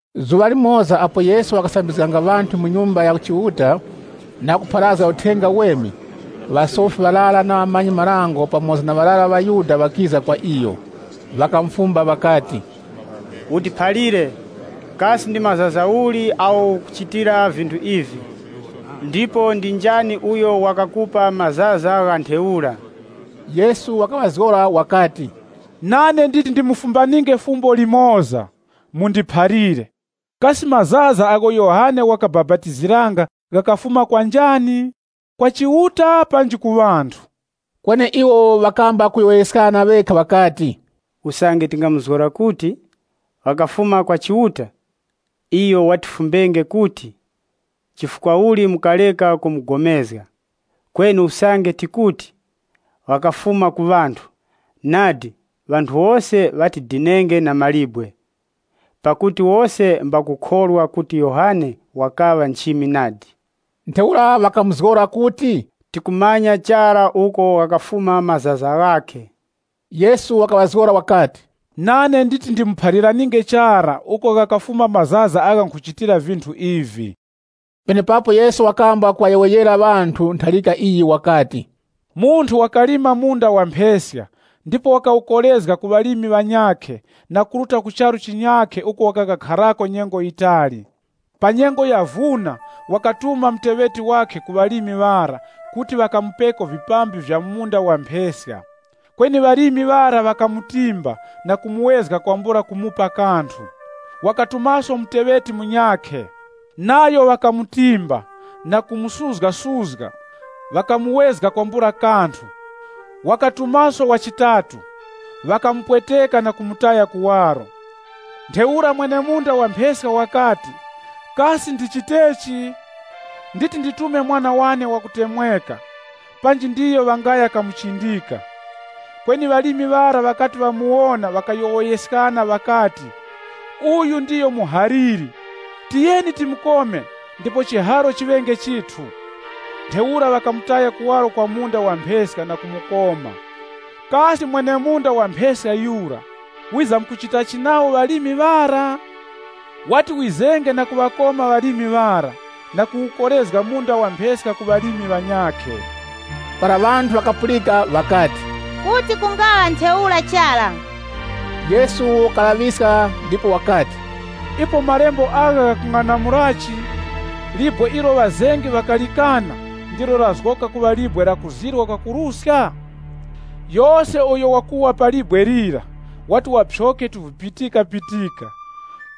Zuŵa limoza apo Yesu wakasambizganga ŵanthu mu Nyumba ya Chiuta, na kupharazga Uthenga Uweme, ŵasofi ŵarara na ŵamanyi-marango, pamoza na ŵarara ŵa ŵaYuda ŵakiza kwa iyo. Ŵakamufumba ŵakati, “Utiphalire, kasi ndi mazaza uli agho ukuchitira vinthu ivi? Ndipo ndi njani uyo wakakupa mazaza gha ntheura?” Yesu wakaŵazgora wakati, “Nane nditi ndimufumbaninge fumbo limoza. Mundiphalire, Kasi mazaza agho Yohane wakabapatiziranga ghakafuma kwa njani? Kwa Chiuta panji ku ŵanthu?” Kweni iwo ŵakamba kuyowoyeskana ŵekha ŵakati, “Usange tingamuzgora kuti, ‘Ghakafuma kwa Chiuta,’ iyo watifumbenge kuti, ‘Chifukwa uli mukareka kupulikana nayo?’ Kweni usange tikuti, ‘Ghakafuma ku ŵanthu,’ nadi ŵanthu wose ŵatidinenge na mawe, pakuti wose mbakukhorwa kuti Yohane wakaŵa nchimi nadi.” Ntheura ŵakamuzgora kuti, “Tikumanya chara uko ghakafuma mazaza ghakhe.” Yesu wakaŵazgora wakati, “Nane nditi ndimuphaliraninge chara uko ghakafuma mazaza agha nkhuchitira vinthu ivi.” Penepapo Yesu wakamba kuŵayowoyera ŵanthu ntharika iyi wakati, “Munthu wakalima munda wa mpheska, ndipo wakawukorezga ku ŵalimi ŵanyakhe na kuruta ku charu chinyakhe uko wakakharako nyengo yitali. Pa nyengo ya vuna, wakatuma muteŵeti wakhe ku ŵalimi ŵara kuti ŵakamupeko vipambi vya mu munda wa mpheska. Kweni ŵalimi ŵara ŵakamutimba na kumuwezga kwambula kumupa kanthu. Wakatumaso muteŵeti munyakhe, nayo ŵakamutimba, na kumusuzgasuzga, ŵakamuwezga kwambula kanthu. Wakatumaso wa chitatu, ŵakamupweteka na kumutaya kuwaro. Ntheura mwene-munda wa mpheska wakati, ‘Kasi ndichitechi? Nditi nditume mwana wane wakutemweka, panji ndiyo ŵangaya kamuchindika.’ Kweni ŵalimi ŵara ŵakati ŵamuwona ŵakayowoyeskana ŵakati, ‘Uyu ndiyo muhaliri, tiyeni timukome ndipo chiharo chiŵenge chithu.’ Ntheura ŵakamutaya kuwaro kwa munda wa mpheska na kumukoma. “Kasi mwene-munda wa mpheska yura, wizamkuchitachi nawo ŵalimi ŵara?” “Wati wizenge na kuŵakoma ŵalimi ŵara na kuwukorezga munda wa mpheska ku ŵalimi ŵanyakhe.” Para ŵanthu ŵakapulika ŵakati, “Kuti kungaŵa ntheura chara.” Yesu wakaŵalaŵiska ndipo wakati, “Ipo malembo agha ghakung'anamulachi, ‘Libwe ilo ŵazengi ŵakalikana, ndilo lazgoka nkhorezgero ya chingodya?’ Yose uyo wakuwa pa libwe lira, wati waphyoke tuvipitikapitika,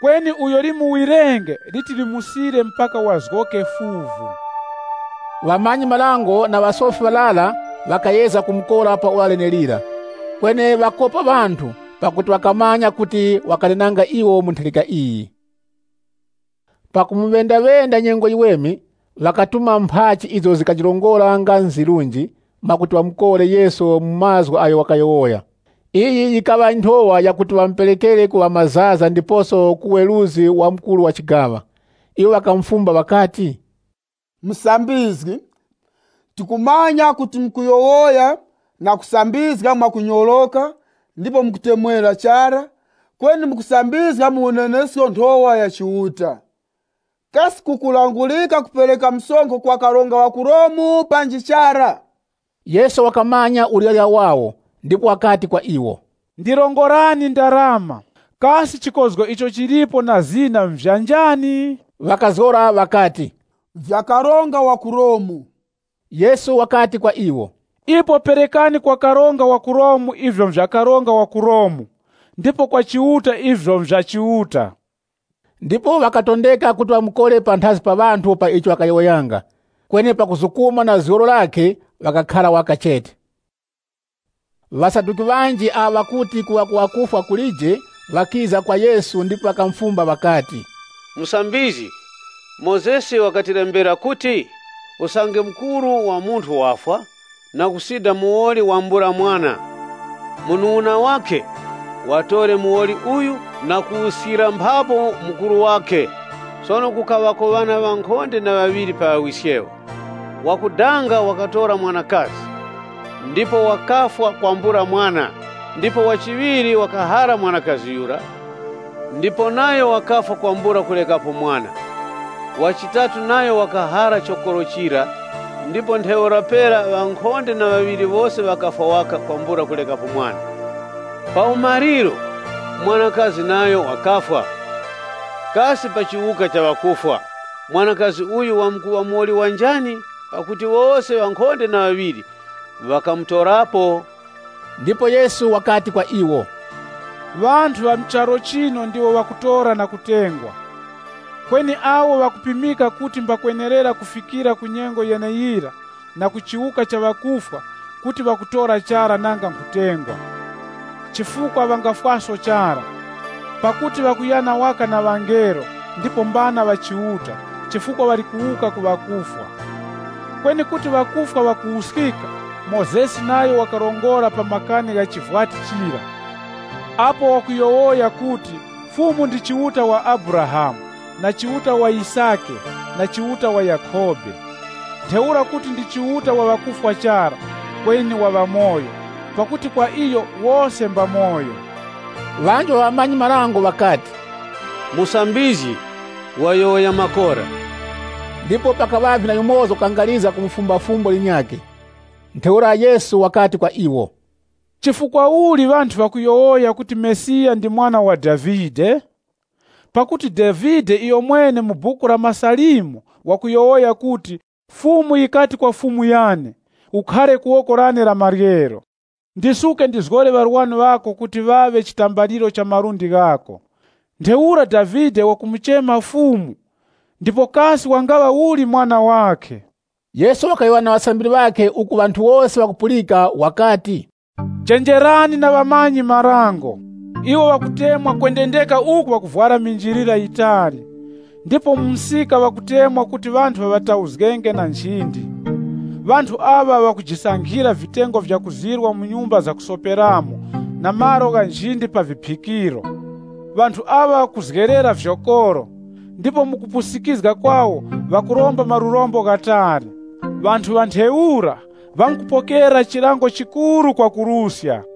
kweni uyo limuwirenge liti limusile mpaka wazgoke fuvu.” Ŵamanyi-marango na ŵasofi ŵarara ŵakayezga kumukora pa ora lenelira, kweni ŵakopa ŵanthu pakuti ŵakamanya kuti wakanenanga iwo mu ntharika iyi. Pakumuŵendaŵenda nyengo yiweme, ŵakatuma mphachi izo zikajirongora kuti nga nzirunji, mwakuti ŵamukore Yesu mu mazgu agho wakayowoya. Iyi yikaŵa nthowa yakuti wamuperekere ku ŵamazaza ndiposo na ku weruzgi wa mukuru wa chigaŵa. Iwo ŵakamufumba ŵakati, “Musambizgi, tikumanya kuti mukuyowoya na kusambizga mwakunyoroka ndipo mukutemwera chara, kweni mukusambizga mu unenesko nthowa ya Chiuta. Kasi kukulangurika kupereka msonkho kwa karonga wa ku Romu panji chara?” Yesu wakamanya uryarya wawo ndipo wakati kwa iwo, “Ndirongorani ndarama. Kasi chikozgo icho chili pa ndarama na zina nvya njani?” Ŵakazgora ŵakati, “Nvya karonga wa ku Romu.” Yesu wakati kwa iwo, “Ipo perekani kwa karonga wa ku Romu ivyo nvya karonga wa ku Romu, ndipo kwa Chiuta ivyo nvya Chiuta.” Ndipo ŵakatondeka kuti ŵamukore panthazi pa ŵanthu pa icho wakayowoyanga, kweni pakuzukuma na zgoro lakhe ŵakakhara waka chete. Ŵasaduki, ŵanji, awo ŵakuti kuwuka ku ŵakufwa kulije ŵakiza kwa Yesu ndipo ŵakamufumba ŵakati, “Musambizgi, Mozesi wakatilembera kuti, ‘Usange mukuru wa munthu wafwa, na kusida muwoli wambula mwana, mubali wakhe watore muwoli uyu na kuwuskira mphapu mukuru wakhe.’ Sono kukaŵako ŵana ŵankhonde na ŵaŵiri pa wiskewo. Wakudanga wakatora mwanakazi ndipo wakafwa kwambula mwana. Ndipo wa chiŵiri wakahara mwanakazi yura ndipo nayo wakafwa kwambula kurekapo mwana. Wa chitatu nayo wakahara chokoro chira ndipo ntheura pera ŵankhonde na ŵaŵiri wose ŵakafwa waka kwambula kurekapo mwana. Pa umaliro, mwanakazi nayo wakafwa. Kasi pa chiwuka cha ŵakufwa, mwanakazi uyu wamkuŵa muwoli wa njani, pakuti wose ŵankhonde na ŵaŵiri ŵakamutorapo?” Ndipo Yesu wakati kwa iwo, “Ŵanthu ŵa mu charu chino ndiwo ŵakutora na kutengwa. Kweni awo ŵakupimika kuti mbakwenerera kufikira ku nyengo yeneyira na ku chiwuka cha ŵakufwa kuti ŵakutora chara nanga nkhutengwa. Chifukwa ŵangafwaso chara, pakuti ŵakuyana waka na ŵangelo ndipo mbana ŵa Chiuta, chifukwa ŵali kuwuka ku ŵakufwa. Kweni kuti ŵakufwa ŵakuwuskika, Mozesi nayo wakarongora pa makani gha chivwati chira, apo wakuti, ‘Fumu ndi Chiuta wa Abrahamu, na Chiuta wa Yisake na Chiuta wa Yakhobe. Ntheura kuti ndi Chiuta wa ŵakufwa chara, kweni wa ŵamoyo, pakuti kwa iyo wose mbamoyo.’” Ŵanji ŵa ŵamanyi-marango ŵakati, “Musambizgi, wayowoya makora.” Ndipo pakaŵavye na yumoza wakakangarizga kumufumba fumbo linyakhe. Ntheura Yesu wakati kwa iwo, “Chifukwa uli ŵanthu ŵakuyowoya kuti Mesiya ndi mwana wa Davide? Pakuti Davide iyomwene mu Buku la MaSalimo wakuti, ‘Fumu yikati kwa Fumu yane, Khara ku woko lane la maryero, ndisuke ndiŵazgore ŵarwani ŵako kuŵa chitambaliro cha malundi ghako.’ Ntheura Davide wakumuchema Fumu, ndipo kasi wangaŵa uli mwana wakhe?” Yesu wakayowoya na ŵasambiri ŵakhe uku ŵanthu wose ŵakupulika wakati, “Chenjerani na ŵamanyi-marango. Iwo ŵakutemwa kwendendeka uku ŵavwara minjilira yitali, ndipo mu msika ŵakutemwa kuti ŵanthu ŵaŵatauzgenge na nchindi. Ŵanthu aŵa ŵakujisankhira vitengo vyakuzirwa mu nyumba zakusoperamo na malo gha nchindi pa viphikiro. Ŵanthu aŵa ŵakuzgerera vyokoro, ndipo mu kupusikizga kwawo ŵakuromba malurombo ghatali. Ŵanthu ŵa ntheura, ŵamkupokera chilango chikuru kwakuruska!”